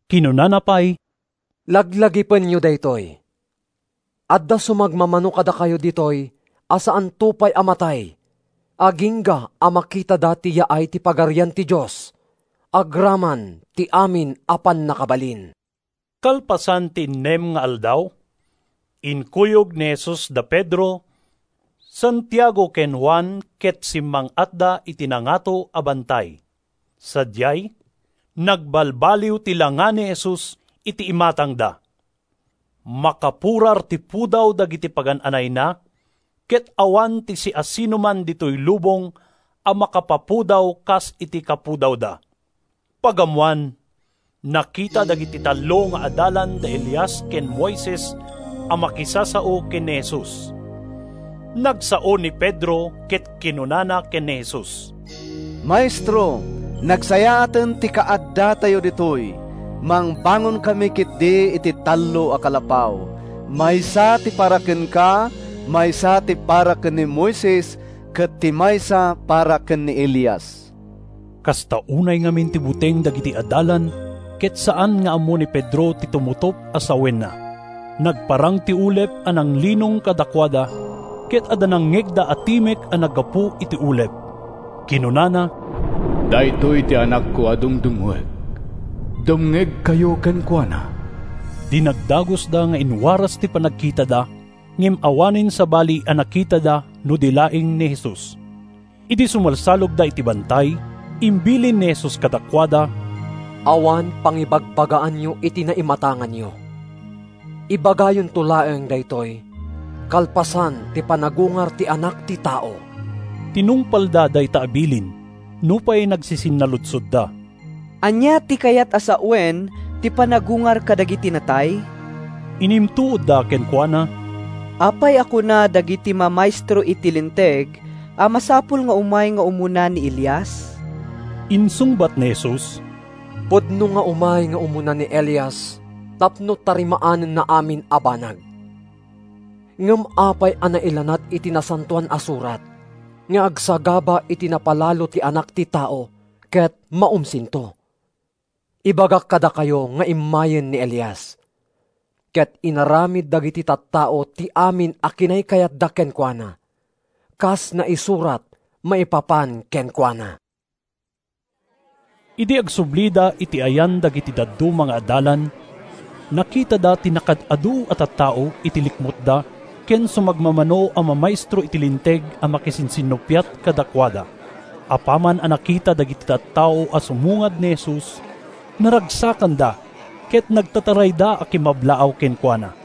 Kinunana pay, “Laglagipenyo daytoy! Adda sumagmamano kadakayo ditoy a saanto pay a matay agingga a makitada ti yaay ti Pagarian ti Dios agraman ti amin a pannakabalin.” Kalpasan ti innem nga aldaw, inkuyog ni Jesus da Pedro, Santiago ken Juan ket simmang-atda iti nangato a bantay. Sadiay, nagbalbaliw ti langa ni Jesus iti imatangda. Makapurar ti pudaw dagiti pagan-anayna ket awan ti siasinoman ditoy lubong a makapapudaw kas iti kapudawda. Pagammoan, nakita dagiti tallo nga adalan da Elias ken Moises a makisasao ken ni Jesus. Nagsao ni Pedro ket kinunana ken ni Jesus: “Maestro, nagsayaaten ti kaaddatayo ditoy! Mangbangonkami ketdi iti tallo a kalapaw: maysa ti para kenka, maysa ti para ken ni Moises, ket ti maysa para ken ni Elias.” Kasta unay ngamin ti buteng dagiti adalan ket saan nga ammo ni Pedro ti tumutop a sawenna. Nagparang ti ulep a nanglinong kadakuada ket adda nangngegda a timek a naggapu iti ulep. Kinunana, “Daytoy ti Anakko a dungdungngoek. Dumngegkayo kenkuana.” Dinagdagusda nga inwaras ti panagkitada, ngem awanen sabali a nakitada no di laeng ni Jesus. Idi sumalsalogda iti bantay, imbilin ni Jesus kadakuada, “Awan pangibagbagaanyo iti naimatanganyo. Ibagayonto laeng daytoy kalpasan ti panagungar ti Anak ti Tao.” Tinungpalda dayta a bilin, nupay nagsisinnaludsodda, “Ania ti kayat a sawen ti ‘panagungar kadagiti natay’?” Inimtuodda kenkuana, “Apay a kuna dagiti mamaestro iti Linteg a masapul nga umay nga umuna ni Elias?” Insungbat ni Jesus, “Pudno nga umay nga umuna ni Elias tapno tarimaanenna amin a banag. Ngem apay a nailanad iti Nasantoan a Surat nga agsagaba iti napalalo ti Anak ti Tao ket maumsinto? Ibagak kadakayo nga immayen ni Elias, ket inaramid dagiti tattao ti amin a kinaykayatda kenkuana, kas naisurat maipapan kenkuana.” Idi agsublida iti ayan dagiti dadduma nga adalan, nakitada ti nakaad-adu a tattao iti likmutda ken sumagmamano a mamaestro iti Linteg a makisinsinnuppiat kadakuada. Apaman a nakita dagiti tattao a sumungad ni Jesus, naragsakanda ket nagtatarayda a kimmablaaw kenkuana.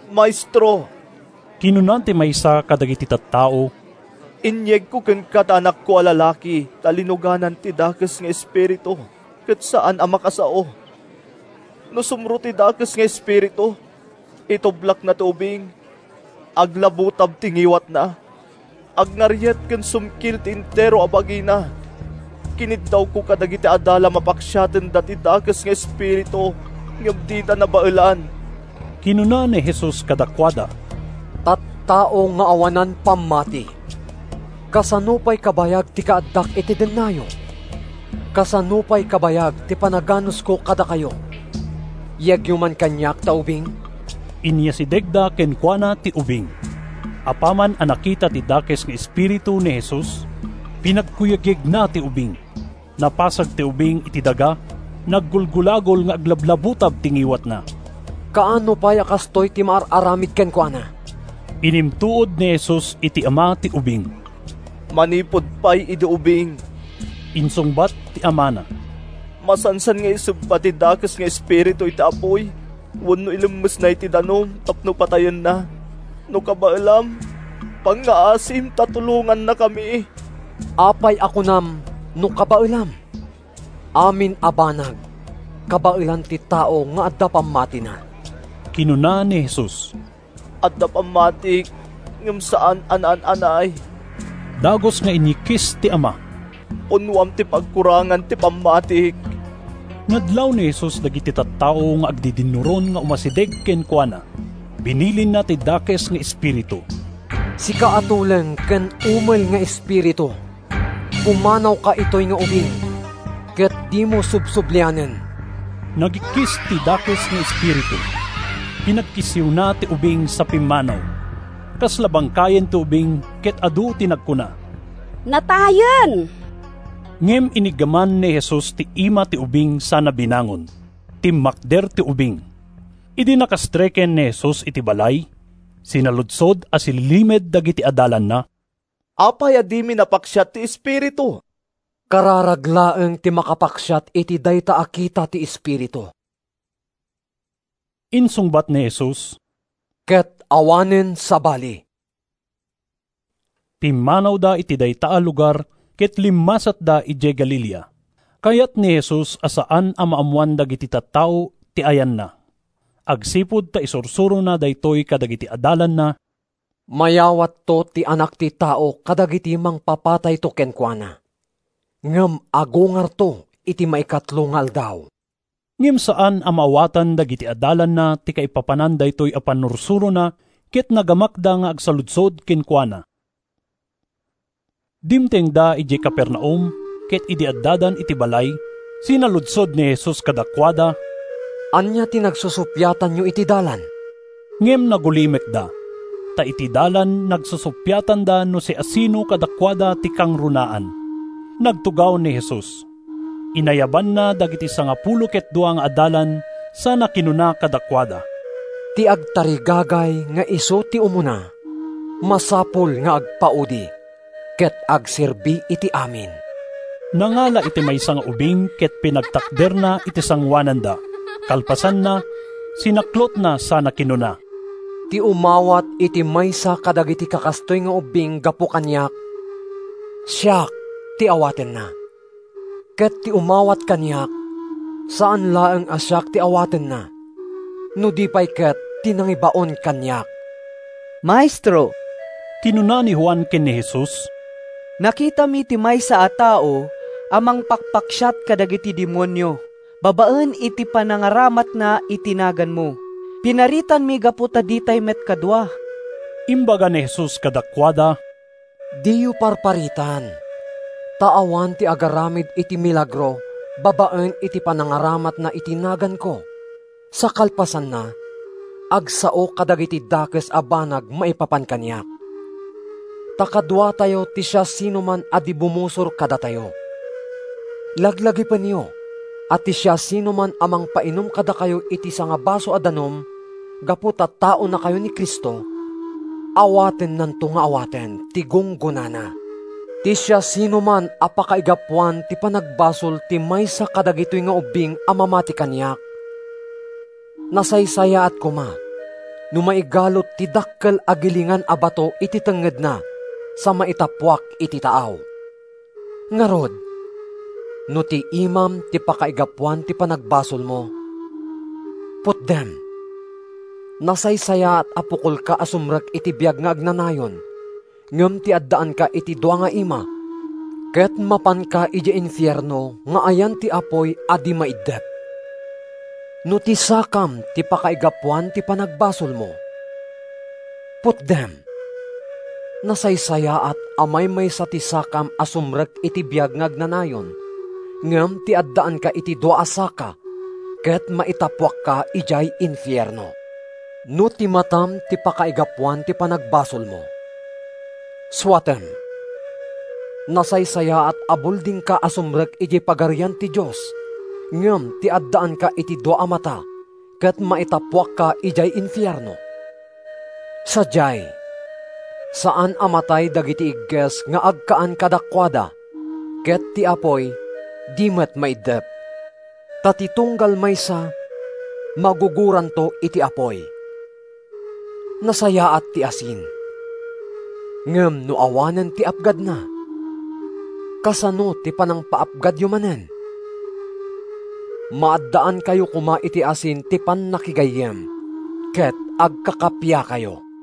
“Maestro,” kinuna ti maysa kadagiti tattao, “inyegko kenka ti anakko a lalaki ta linuganan ti dakes nga espiritu ket saan a makasao. No sumro ti dakes nga espiritu, itublakna ti ubing. Aglabutab ti ngiwatna, agngariet ken sumkil ti entero a bagina. Kiniddawko kadagiti adalam a paksiatenda ti dakes nga espiritu, ngem dida nabaelan.” Kinuna ni Jesus kadakuada, “Tattao nga awanan pammati! Kasano pay kabayag ti kaaddak iti dennayo? Kasano pay kabayag ti panaganusko kadakayo? Yegyo man kaniak ta ubing.” Inyasidegda kenkuana ti ubing. Apaman a nakita ti dakes nga espiritu ni Jesus, pinagkuyegyegna ti ubing. Napasag ti ubing iti daga, naggulgulagol nga aglablabutab ti ngiwatna. “Kaano pay a kastoy ti maar-aramid kenkuana?” inimtuod ni Jesus iti ama ti ubing. “Manipud pay idi ubing,” insungbat ti amana. “Masansan nga isebba ti dakes nga espiritu iti apuy wenno ilemmesna iti danum tapno patayenna. No kabaelam, pangngaasim ta tulongannakami!” “Apay a kunam ‘No kabaelam?’ Amin a banag kabaelan ti tao nga adda pammatina,” kinuna ni Jesus. “Adda pammatik ngem saan a naan-anay,” dagus nga inyikkis ti ama. “Punnoam ti pagkurangan ti pammatik.” Nadlaw ni Jesus dagiti tattao nga agdidinnuron nga umasideg kenkuana. Binilinna ti dakes nga espiritu, “Sika a tuleng ken umel nga espiritu, pumanawka itoy nga ubing ket dimo subsublianen.” Nagikkis ti dakes nga espiritu, pinagkissiwna ti ubing sa pimmanaw. Kasla bangkayen ti ubing ket adu ti nagkuna: “Natayen!” Ngem iniggaman ni Jesus ti ima ti ubing sana binangon. Timmakder ti ubing. Idi nakastreken ni Jesus iti balay, sinaludsod a sililimed dagiti adalanna, “Apay a dimi napaksiat ti espiritu?” “Kararag laeng ti makapaksiat iti dayta a kita ti espiritu,” insungbat ni Jesus, “ket awanen sabali.” Pimmanawda iti dayta a lugar ket limmasatda idiay Galilea. Kayat ni Jesus a saan a maammoan dagiti tattao ti ayanna agsipud ta isursurona daytoy kadagiti adalanna: “Mayawatto ti Anak ti Tao kadagiti mangpapatayto kenkuana. Ngem agungarto iti maikatlo nga aldaw.” Ngem saan a maawatan dagiti adalanna ti kaipapanan daytoy a pannursurona ket nagamakda nga agsaludsod kenkuana. Dimtengda idiay Capernaum ket idi addadan iti balay, sinaludsod ni Jesus kadakuada, “Ania ti nagsusuppiatanyo iti dalan?” Ngem nagulimekda, ta iti dalan nagsusuppiatanda no siasino kadakuada ti kangrunaan. Nagtugaw ni Jesus. Inayabanna dagiti sangapulo ket dua nga adalan sana kinuna kadakuada, “Ti agtarigagay nga isu ti umuna, masapul nga agpaudi, ket agserbi iti amin.” Nangala iti maysa nga ubing ket pinagtakderna iti sangoananda. Kalpasanna, sinaklotna sana kinuna, “Ti umawat iti maysa kadagiti kakastoy nga ubbing gapu kaniak, siak ti awatenna. Ket ti umawat kaniak, saan laeng a siak ti awatenna no di pay ket ti nangibaon kaniak.” “Maestro,” kinuna ni Juan ken ni Jesus, “nakitami ti maysa a tao a mangpakpaksiat kadagiti demonio babaen iti panangaramatna iti naganmo. Pinaritanmi gapu ta ditay met kadua.” Imbaga ni Jesus kadakuada, “Diyo parparitan, ta awan ti agaramid iti milagro babaen iti panangaramatna iti naganko sa kalpasanna agsao kadagiti dakes a banag maipapan kaniak. Ta kaduatayo ti siasinoman a di bumusor kadatayo. Laglagipenyo a ti siasinoman a mangpainum kadakayo iti sangabaso a danum gapu ta taonakayo ni Cristo, awatennanto nga awaten ti gunggonana.” “Ti siasinoman a pakaigapuan ti panagbasol ti maysa kadagitoy nga ubbing a mamati kaniak, nasaysayaat koma no maigalut ti dakkel a gilingan a bato iti tengngedna sa maitappuak iti taaw. Ngarud, no ti imam ti pakaigapuan ti panagbasolmo, putdem. Nasaysayaat a pukolka a sumrek iti biag nga agnanayon ngem ti addaanka iti dua nga ima ket mapanka idiay infierno nga ayan ti apuy a di maiddep. No ti sakam ti pakaigapuan ti panagbasolmo, putdem. Nasaysayaat a maymaysa ti sakam a sumrek iti biag nga agnanayon ngem ti addaanka iti dua a saka ket maitappuakka idiay infierno. No ti matam ti pakaigapuan ti panagbasolmo, suatem. Nasaysayaat a buldingka a sumrek idiay Pagarian ti Dios ngem ti addaanka iti dua a mata ket maitappuakka idiay infierno. Sadiay, ‘saan a matay dagiti igges nga agkaan kadakuada ket ti apuy di met maiddep.’ “Ta ti tunggal maysa magugoranto iti apuy. Nasayaat ti asin; ngem no awanen ti apgadna, kasano ti panangpaapgadyo manen? Maaddaankayo koma iti asin ti pannakigayyem, ket agkakappiakayo.”